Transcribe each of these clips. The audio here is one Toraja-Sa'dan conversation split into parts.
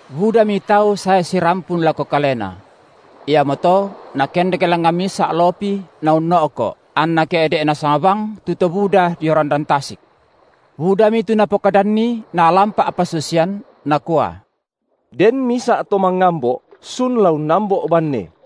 Budami tau sae sirampun lako Kalena. Iamoto Nakendek langngan misa’ lopi Naunno’ko’, anna ke’de’ nasang bang tu to buda dio randan tasik. Budami tu Napokadanni Naalan pa’pasusian, Nakua: Den misa’ to mangambo’ sun la unnambo’ banne;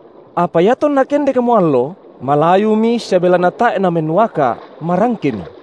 Apa iatonna kendekmo allo, malayumi sia belanna tae’ namennuaka’, marangkemi.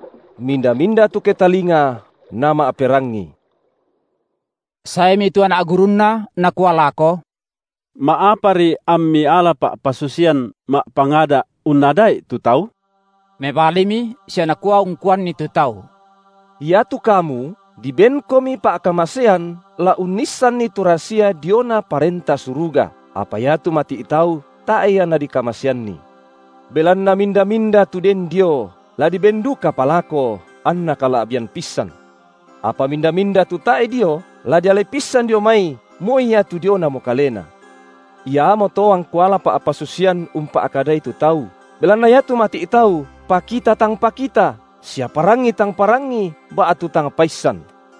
Minda-minda tu ketalinga, nama’perangi. Saemi tu anak gurunNa nakua lako: Ma’apari amMi ala pa’pasusian ma’pangada’ unnada’i tu tau? Mebalimi sia Nakua ungkuanni tu tau: Iatu kamu dibenkomi pa’kamasean la unnissanni tu rasia diona Parenta Suruga, apa iatu mati’ tau tae’ ia dikamaseanni. Belanna minda-minda tu den dio, la diben dukapa lako, anna kala’bian pissan. Apa minda-minda tu tae’ dio, la dialai pissan dio mai moi iatu dionamo kalena. Iamoto angKu ala pa’pasusian umpa’kadai tu tau, belanna iatu mati’ tau pakita tang pakita, sia parangi tang parangi ba’tu tang paissan.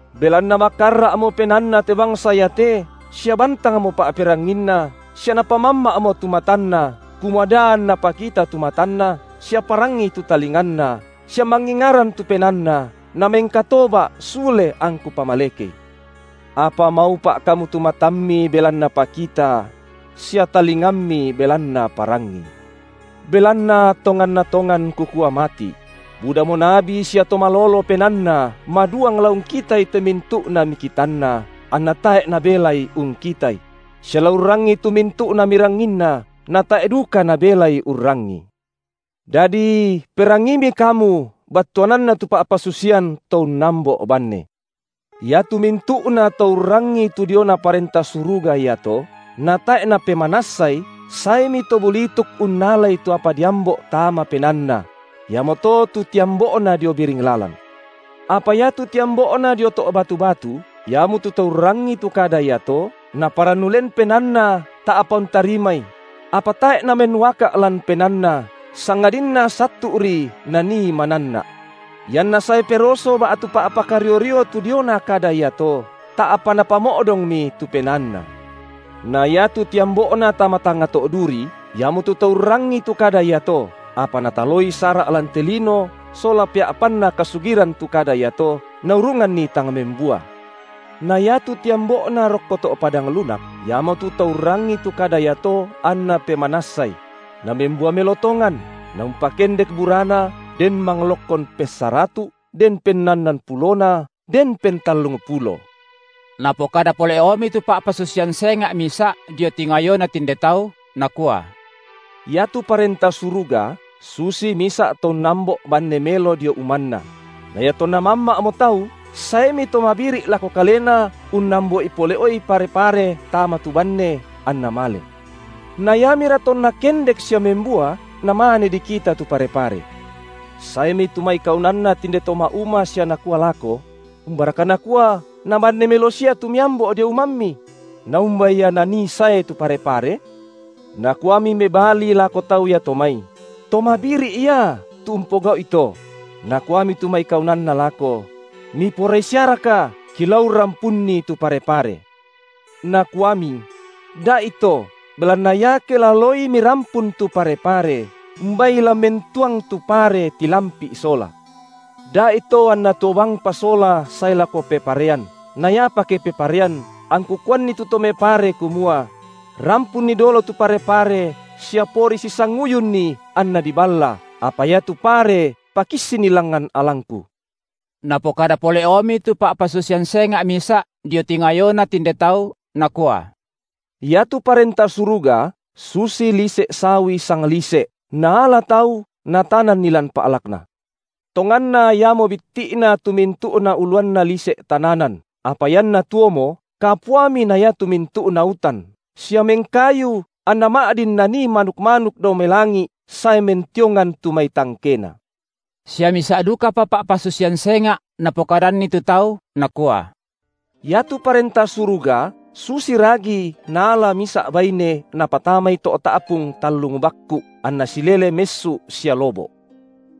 Belanna makarra’mo penaanna te bangsa iate, sia bantangmo pa’peranginna, sia napamamma’mo tu matanna, kumua da anna pakita tu matanna, sia parangi tu talinganna, sia mangingaran tu penaanna, namengkatoba’ sule angKu pamalekei. Apa maupa’ kamu tu matammi belanna pakita, sia talingammi belanna parangi. Belanna tonganna tongan Kukua mati’; Budamo nabi sia to malolo penaanna maduang la ungkitai te mintu’na mikitanna, anna tae’ nabelai ungkitai; sia la urrangii tu mintu’na miranginna, na tae’ duka nabelai urrangii. Dadi perangiimi kamu battuanna tu pa’pasusian to unnambo’banne! Iatu mintu’nato urrangii tu diona Parenta Suruga iato, natae’ napemanassai, saemi to bulituk unnalai tu apa diambo’ tama penaanna; iamoto tu tiambo’na dio biring lalan. Apa iatu tiambo’na dio to’ batu-batu, iamotu to urrangii tu kada iato, naparannu len penaanna ta’pa untarimai; apa tae’ namennuaka’ lan penaanna, sangadinna sattu’ri, nanii mananna’. Ianna sae peroso ba’tu pa’pakario-rio tu diona kada iato, ta’pa napamo’dongmi tu penaanna. Na iatu tiambo’na tama tangnga to’ duri, iamotu to urrangii tu kada iato, apa nataloi sara’ lan te lino sola pea’panna kasugiran tu kada iato, naurunganni tang membua. Na iatu tiambo’na rokko to’ padang lunak, iamotu to urrangii tu kada iato anna pemanassai; namembua melo tongan, naumpakendek burana, den manglokkon pessaratu’, den pennannan pulona, den pentallungpulo. Napokada pole’omi tu pa’pasusian senga’ misa’ dio tingayona tinde tau, Nakua: Iatu Parenta Suruga susi misa’ to unnambo’ banne melo dio umanna; na iatonna mamma’mo tau, saemi to mabiri’ lako kalena unnambo’i pole’i pare-pare tama tu banne, anna male. Na iamira tonna kendek sia membua, namane dikita tu pare-pare. Saemi tu mai kaunanna tinde to ma’uma sia nakua lako: Umbaraka nakua na banne melo sia tu miambo’ dio umammi? Naumba ia nanii sae tu pare-pare? Nakuami mebali lako tau iato mai: To mabiri’ ia, tu umpogau’i to. Nakuami tu mai kaunanna lako: Miporai siaraka, kilao urrampunni tu pare-pare? Nakuami: Da’ito, belanna iake la laoi mirampun tu pare-pare, umbai la mentuang tu pare tilampi’ sola. Da’ito anna tuo bangpa sola sae lako peparean, na iapa ke peparean angku kuanni tu to mepare kumua: Rampunni dolo tu pare-pare sia pori sisanguyunni anna diballa, apa iatu pare pakissinni langngan alangku. Napokada pole’omi tu pa’pasusian senga’ misa’ dio tingayona tinde tau, Nakua: Iatu Parenta Suruga susi lise’ sawi sanglise’, naala tau natananni lan pa’lakna. Tonganna iamo bitti’na tu mintu’na uluanna lise’ tananan, apa ianna tuomo, kapuami na iatu mintu’na utan, sia mengkayu, anna ma’din nanii manuk-manuk dao mai langi’ sae mentiongan tu mai tangkena. Sia misa’ dukapa pa’pasusian senga’ Napokadanni tu tau Nakua: Iatu Parenta Suruga susi ragi naala misa’ baine, napatamai to’ ta’pung tallung bakku’, anna silele messu’ sia lobo’.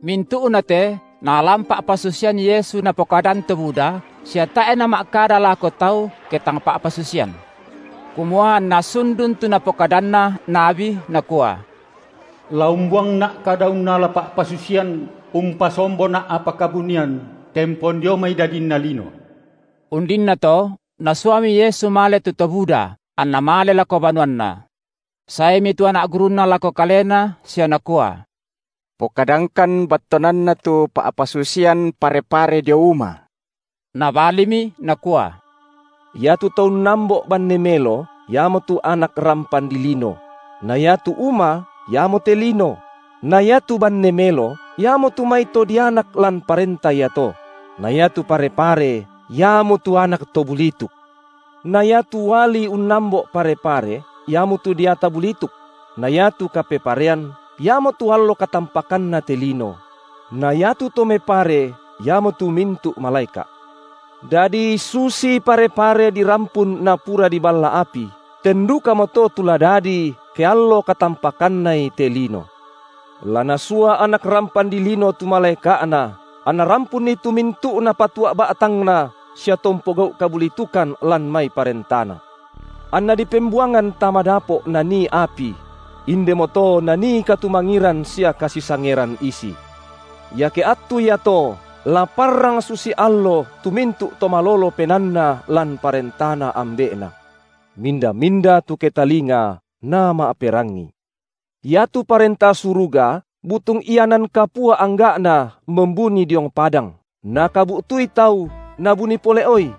Mintu’nate naalan pa’pasusian Yesu Napokadan to buda, sia tae’ nama’kada lako tau ke tang pa’pasusian. Kumua anna sundun tu napokadanna nabi nakua: La umbuangNa’ kada unnala pa’pasusian, umpasomboNa’ apa kabunian tempon dio mai mai dadinna lino. Undinnato, Nasuami Yesu male tu to buda, anNa male lako banuanNa. Saemi tu anak gurunNa lako Kalena sia nakua: Pokadangkan battuananna tu pa’pasusian pare-pare dio uma. Nabalimi Nakua: Iatu to unnambo’ banne melo, iamotu Anak rampan dilino; na iatu uma, iamote lino; na iatu banne melo, iamotu mai to dianak lan Parenta iato; na iatu pare-pare, iamotu anak to bulituk. Na iatu uali unnambo’ pare-pare, iamotu deata bulituk; na iatu kapeparean, iamotu allo katampakanna te lino; na iatu to mepare, iamotu mintu’ malaeka’. Dadi susitu pare-pare dirampun napura diballa api, ten dukamoto tu la dadi ke allo katampakannai te lino. La Nasua Anak rampan dilino tu malaeka’Na, anna rampunni tu mintu’na patua’ ba’tangna sia to umpogau’ kabulitukan lan mai ParentaNa. Anna dipembuangan tama dapo’ nanii api; indemoto nanii katumangiran sia kasisangeran isi. Iake attu iato la parrang susi allo tu mintu’ to malolo penaanna lan Parentana Ambe’Na. Minda-minda tu ketalinga, nama’perangi. Iatu Parenta Suruga butung ianan kapua angga’na membuni diong padang, nakabu’tui tau, nabuni pole’oi;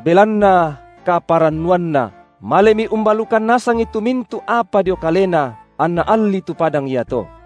belanna kaparannuanna, malemi umbalukan nasangi tu mintu’ apa dio kalena, anna allii tu padang iato.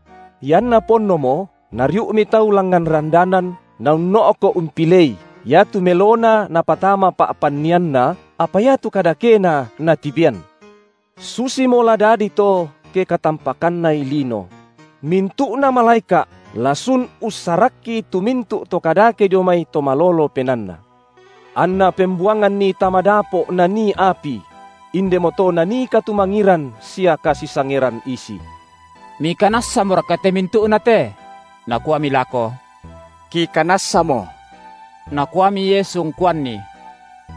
Ianna ponnomo, nariu’mi tau langngan randanan, naunno’ko’ umpilei, iatu melona napatama pa’pannianna, apa iatu kadakena natibean. Susimo la dadi to ke katampakannai lino: mintu’na malaeka’ la sun ussarakki tu mintu’ to kadake dio mai to malolo penaanna. Anna pembuanganni tama dapo’ nanii api; indemoto nanii katumangiran sia kasisangeran isi. Mikanassamoraka te mintu’na te? Nakuami lako: Kikanassamo. Nakuami Yesu ungkuanni: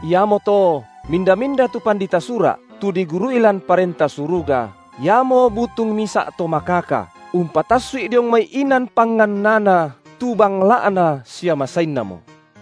Iamoto minda-minda tu pandita Sura’, tu digurui lan Parenta Suruga, iamo butung misa’ to makaka, umpatassu’i diong mai inan pangannana tu bangla’na sia masainnamo.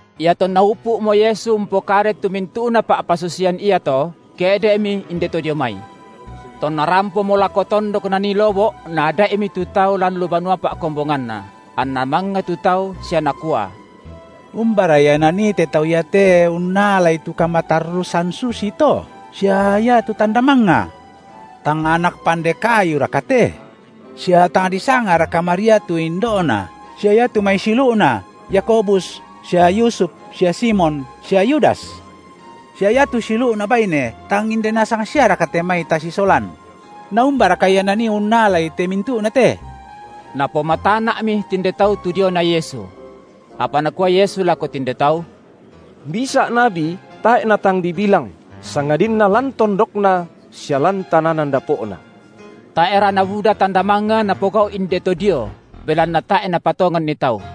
Iatonna upu’mo Yesu umpokadai tu mintu’na pa’pasusian iato, ke’de’Mi inde to dio mai. Tonna rampomo lako tondok Nanii lobo’ Naada’imi tu tau lan lu banua pa’kombonganna, anna mangnga tu tau sia nakua: Umbara Ia Nanii te Tau iate unnalai tu kamatarrusan susito, sia iatu tanda mangnga? Tang anak pande kayuraka te? Sia tang disangaraka Maria tu indo’Na sia iatu mai siulu’Na, Yakobus sia Yusuf sia Simon sia Yudas? Sia iatu siulu’Na baine tang inde nasang siaraka te mai tasisolan? Naumbaraka Ia Nanii unnalai te mintu’na te? Napomatana’mi tinde tau tu diona Yesu. Apa Nakua Yesu lako tinde tau: Misa’ nabi tae’ natang dibilang, sangadinna lan tondokna sia lan tananan dapo’na. Tae’ra nabuda tanda mangnga Napogau’ inde to dio, belanna tae’ napatonganNi tau.